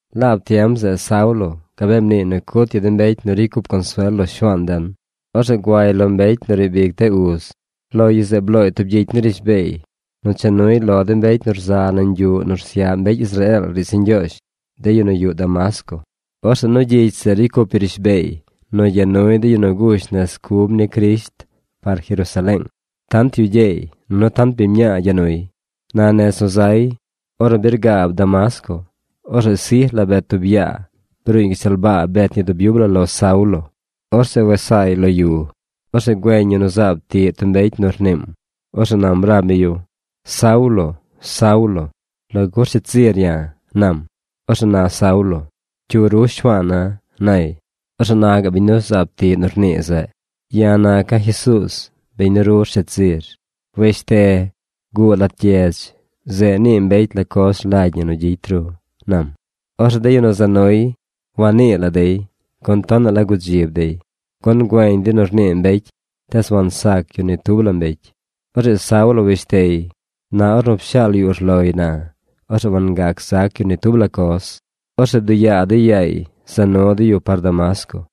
Laab tiem zeꞌ Saulo gabee mniiy nu cut yu de mbecy nu ricy cup consuel lo Shuaan den. Orzeꞌ guay lo mbecy nu riib ic de uz. Lo yu zeꞌ blooy tub gyicy ni rishbeey nu cha nuy lo de mbecy nu rza nañ yuꞌ nu rsyaꞌ mbecy Israeel riidz ni Ñgyoozh, de yu nu yuꞌ Damasco. Orzeꞌ nu gyicy zeꞌ ricy cup yu rishbeey nu gya nuy de yu nu gush nez cub ni Crisht par Jerusaleeng. Tant yu gyeey nunu tant biñ mñaa gya nuy. Na nez nu zay, ornu birgaab Damasco, orzeꞌ sij la bet tub yaa. Bruuñ gashtal baa bet ñi dub yub la lo Saulo. Orzeꞌ wes saay lo yu. Orzeꞌ güeñ yu nu zaab tiꞌ tub mbecy rniim. Orzeꞌ nam rab mi yu: ―Saulo, Saulo, ¿lagu rsheed zir ya̱? ―nam. Orzeꞌ na Saulo: ―¿Cyu ru Shuaana̱? ―nay. Orzeꞌ na gaꞌ biñ nu zaab tiꞌ nu rnii zeꞌ. ―Ya̱ naca̱ Jesuuz, biñ nu ru rsheed zir. Weshte. Guꞌ lat gyedz. Zeꞌ nii mbecy la coz rlagy ñi nu gyicy ru ―nam. Orzeꞌ de yu nu za nuy wagnii la dey, gun tonaꞌ la gudzib dey, gun güeñ dey nu rnii mbecy, tees wansac yu ni tub la mbecy. Orzeꞌ Saulo weshtey. Na ornu pshaal yu urloy na, orzeꞌ wangac zac yu ni tub la coz. Orzeꞌ bduꞌ yaa dey yaay za nu dey yu par Damasco.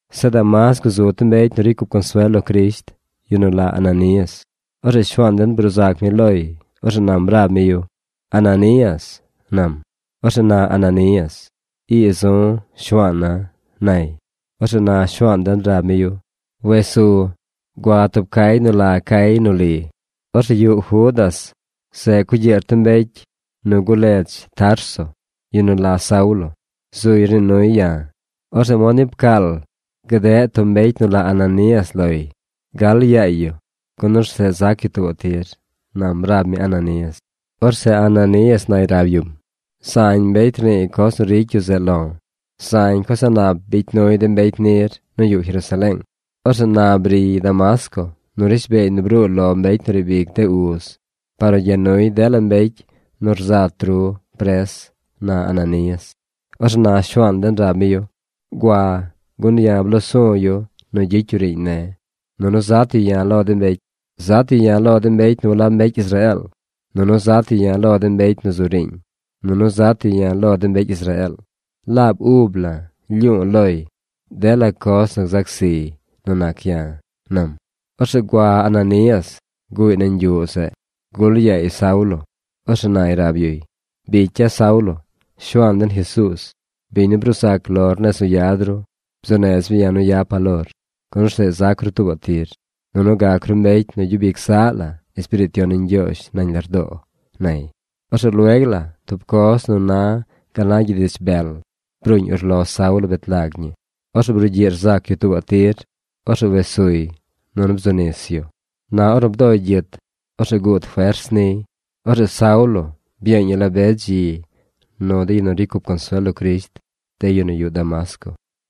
Zeꞌ Damasco zu tub mbecy nu ricy cup consuel lo Crisht, yu nu la Ananías. Orzeꞌ Shuaan den bruu zac mi loy. Orzeꞌ nam rab mi yu: ―¡Ananías! ―nam. Orzeꞌ na Ananías: ―Ii zu, Shuaana̱ ―nay. Orzeꞌ na Shuaan den rab mi yu: ―Wes su. Gua tub cay nu la Cay nu Li. Orzeꞌ yuꞌ Judas zeꞌ cugyiꞌr tub mbecy nu ledz Tarso, yu nu la Saulo. Zuy rnii nuy ya̱. Orzeꞌ mod ni pcaal bdeꞌ tub mbecy nu la Ananías loy. Gal yaay yu gun orzeꞌ zac yu tuubaꞌ tir ―nam rab mi Ananías. Orzeꞌ Ananías nay rab yum: ―Zañ mbecy rniiy coz nu ricy yu zeꞌ lo̱. Zañ coz a̱ꞌ nap bicy nuy de mbecy nir nu yuꞌ Jerusaleeng. Orzeꞌ na briy Damasco nu rishbeey nu bruu lo mbecy nu riib ic de uz par nu gya nuy dela mbecy nu rzat ru pres ―na Ananías. Orzeꞌ na Shuaan den rab mi yu: ―Gua gun ya̱ bloo su̱ yu nu gyicy yu riiñ ne̱, nunu zat yu ya̱ lo de mbecy. Zat yu ya̱ lo de mbecy nu walab mbecy Israeel. Nunu zat yu ya̱ lo de mbecy nu zu riiñ. Nunu zat yu ya̱ lo de mbecy Israeel. Laab ub la̱ lyu̱u̱ loy dela coz nu gzac ziy nu nac ya̱ ―nam. Orzeꞌ gua Ananías. Guꞌy nañ yuꞌ zeꞌ. Gul yaay Saulo. Orzeꞌ nay rab yuy: ―Bicya̱ Saulo, Shuaan den Jesuuz, biñ nu bruu zac lor nez nu yad ru, bzuu nez mi ya̱ nu yapa̱ lor, gun orzeꞌ zac ru tuubaꞌ tir, nunu gac ru mbecy nu gyub ic zaꞌ la Espiriit Yon ni Ñgyoozh nañ lardoo ―nay. Orzeꞌ lueg la tub coz nu na gal na gyid ich bel bruuñ urlo Saulo bet lag ñi. Orzeꞌ brugyiꞌ rzac yu tuubaꞌ tir. Orzeꞌ wes suy, nunu bzu nis yu. Na ornu bdoy gyit, orzeꞌ guud fers niy. Orzeꞌ Saulo byeeñ yu la be dzi nu de yu nu ricy cup consuel lo Crisht, de yu nu yuꞌ Damasco.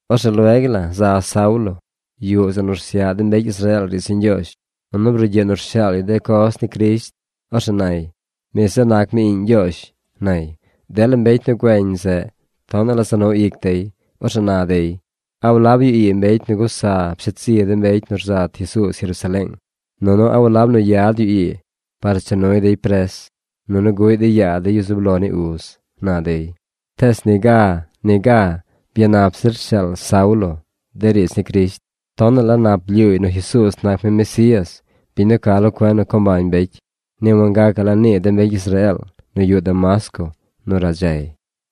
Orzeꞌ lueg la za Saulo yuꞌ zeꞌ nu rsyaꞌ de mbecy Israeel riidz ni Ñgyoozh, nunu brugyiꞌ nu rshaal yu de coz ni Crisht. Orzeꞌ nay: ―Mi zeꞌ nac mi iꞌñ Ñgyoozh ―nay. Dela mbecy nu güeñ zeꞌ tonaꞌ la za nu ic dey. Orzeꞌ na dey: ―¿A walab yu ii mbecy nu gusa pshet zi de mbecy nu rzat Jesuuz Jerusaleeng? Nunu ¿a walab nu yad yu ii par nu cha nuy dey pres, nunu guꞌy dey yaa de yu zub lo ni uz? ―na dey. Tees niga niga byanap zir rshaal Saulo de riidz ni Crisht. Tonaꞌ la nap blyuuy nu Jesuuz nac mi Mesías, biñ nu ca lo cuen nu co mbañ mbecy. Ni wangacaꞌ la nii de mbecy Israeel nu yuꞌ Damasco nu radzay.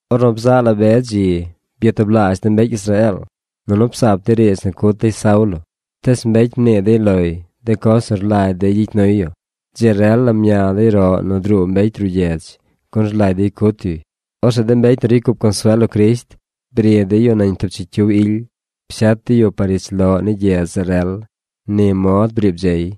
Ornu bzaꞌ la be dzi, byatublaazh de mbecy Israeel, nunu psaap dey riidz nu cut dey Saulo. Tees mbecy mnii dey loy de coz nu rlagy dey gyicy nuy yu. Dzi rel la mña dey de roꞌ nu druu mbecy ruꞌ gyedz, gun rlagy dey cut yuy. Orzeꞌ de mbecy nu ricy cup consuel lo Crisht bri dey yu nañ tub chicyiw ily. Pshet dey yu par ich loꞌ ni gyedz zeꞌ rel. Ni mod briib dzey.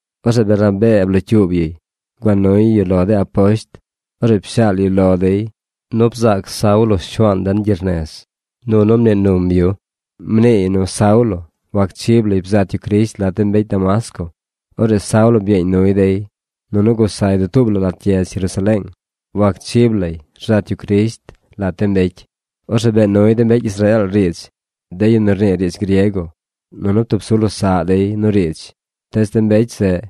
Orzeꞌ Bernabee blocyuub yuy. Gua nuy yu lo de aposht. Orzeꞌ pshaal yu lo dey nu bzaac Saulo Shuaan den gyernez, nunu mnii num yu. Mniiy nu Saulo wacchib lay bzat yu Crisht lat de mbecy Damasco. Orzeꞌ Saulo byeeñ nuy dey, nunu gusay dutuub la lat gyedz Jerusaleeng. Wacchib lay rzat yu Crisht lat de mbecy. Orzeꞌ bee nuy de mbecy Israeel riidz, de yu nu rnii riidz griego. Nunu ptub su losaꞌ dey nu riidz. Tees de mbecy zeꞌ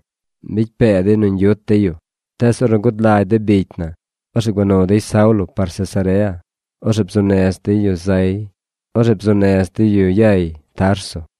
mbicy pee dey nu ñgyut dey yu. Tees ornu gud lagy de bicy na, orzeꞌ gua nu dey Saulo par Cesarea. Orzeꞌ bzuu nez dey yu yay Tarso.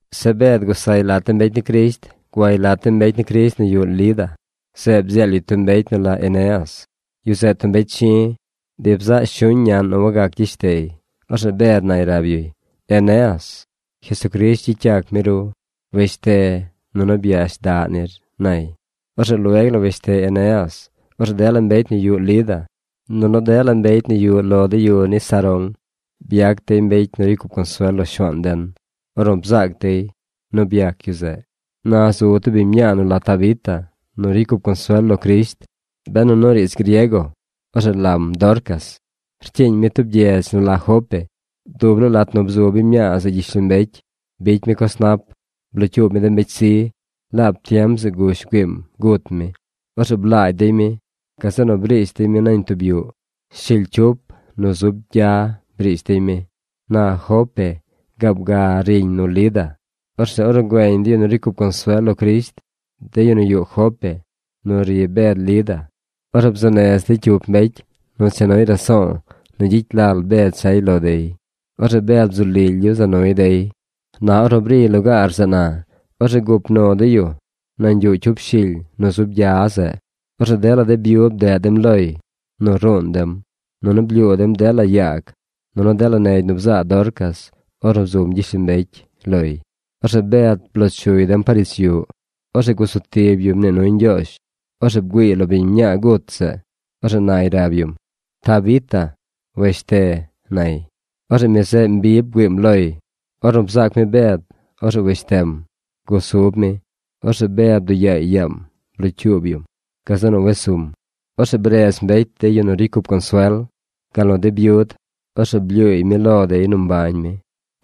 Zeꞌ Bed gusay lat de mbecy ni Crisht. Guay lat de mbecy ni Crisht nu yuꞌ Lida. Zeꞌ bdzeel yu tub mbecy nu la Eneas. Yu zeꞌ tub mbecy chi̱. Bi bzaꞌ shuñ ñaꞌn nu wagac gyeshtey. Orzeꞌ Bed nay rab yuy: ―Eneas, Jesucrisht gyicy yac mi ru. Weshte, nunu byash daꞌ nir ―nay. Orzeꞌ lueg la weshte Eneas. Orzeꞌ dela mbecy nu yuꞌ Lida, nunu dela mbecy nu yuꞌ lo de yu ni Sarón byac dey mbecy nu ricy cup consuel lo Shuaan den ornu bzaac dey nu byac yu zeꞌ. Na zu tub biñ mñaa nu la Tabita nu ricy cup consuel lo Crisht. Benu nu riidz griego, orzeꞌ lam Dorcas. Rcyiiñ mi tub gyedz nu la Jope. Dub laa lat nu bzu biñ mñaa zeꞌ gyishlombecy, bicy mi coz nap. Blocyuub mi de mbecy zi. Laab tiem zeꞌ gush güiim gut mi. Orzeꞌ blaagy dey mi. Gazeꞌ nu briish dey mi nañ tub yuꞌ. Shily cyup nu zub gya briish dey mi. Na Jope gaab ga riñ nu Lida. Orzeꞌ ornu güeñ de yu nu ricy cup consuel lo Crisht, de yu nu yuꞌ Jope nu ri Bed Lida, orzeꞌ bzuu nez dey cyup mbecy nu cha nuy raso̱o̱ nu gyicy lal Bed chay lo dey. Orzeꞌ Bed bzu lily yu za nuy dey. Na ornu briy lugaar zeꞌ na, orzeꞌ gup nu dey yu nañ yuꞌ cyup shily nu zub gya zeꞌ. Orzeꞌ dela de byud bdeꞌ dem loy nu ruun dem. Nunu blyuu dem dela yaag, nu dela negy nu bzaa Dorcas ornu bzum gyishlombecy loy. Orzeꞌ Bed bloo chuy dem par ich yuꞌ. Orzeꞌ gusu tib yu mnii nuy Ñgyoozh. Orzeꞌ bgüiiy lo biñ mñaa gut zeꞌ. Orzeꞌ nay rab yum: ―¡Tabita, weshte! ―nay. Orzeꞌ mi zeꞌ mbi bgüiim loy. Ornu bzaac mi Bed, orzeꞌ weshtem. Gusub mi. Orzeꞌ Bed bduꞌ yaay yaam blocyuub yum. Gazeꞌ nu wes sum. Orzeꞌ bredz mbecy de yu nu ricy cup consuel, gal nu de byud. Orzeꞌ blyuuy mi lo dey nu mbañ mi.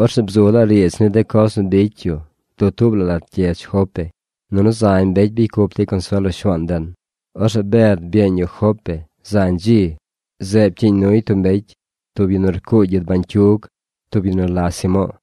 Orzeꞌ bzu laa riidz ni de coz nu bicy yu dutuub la gyedz Jope. Nunu zañ mbecy bicy cup dey consuel lo Shuaan den. Orzeꞌ Bed byeeñ yu Jope zañ dzi. Zeꞌ pcyiiñ nuy tub mbecy, tub yu nu rcuugy gyid bañcyug, tub yu nu la Simo̱o̱.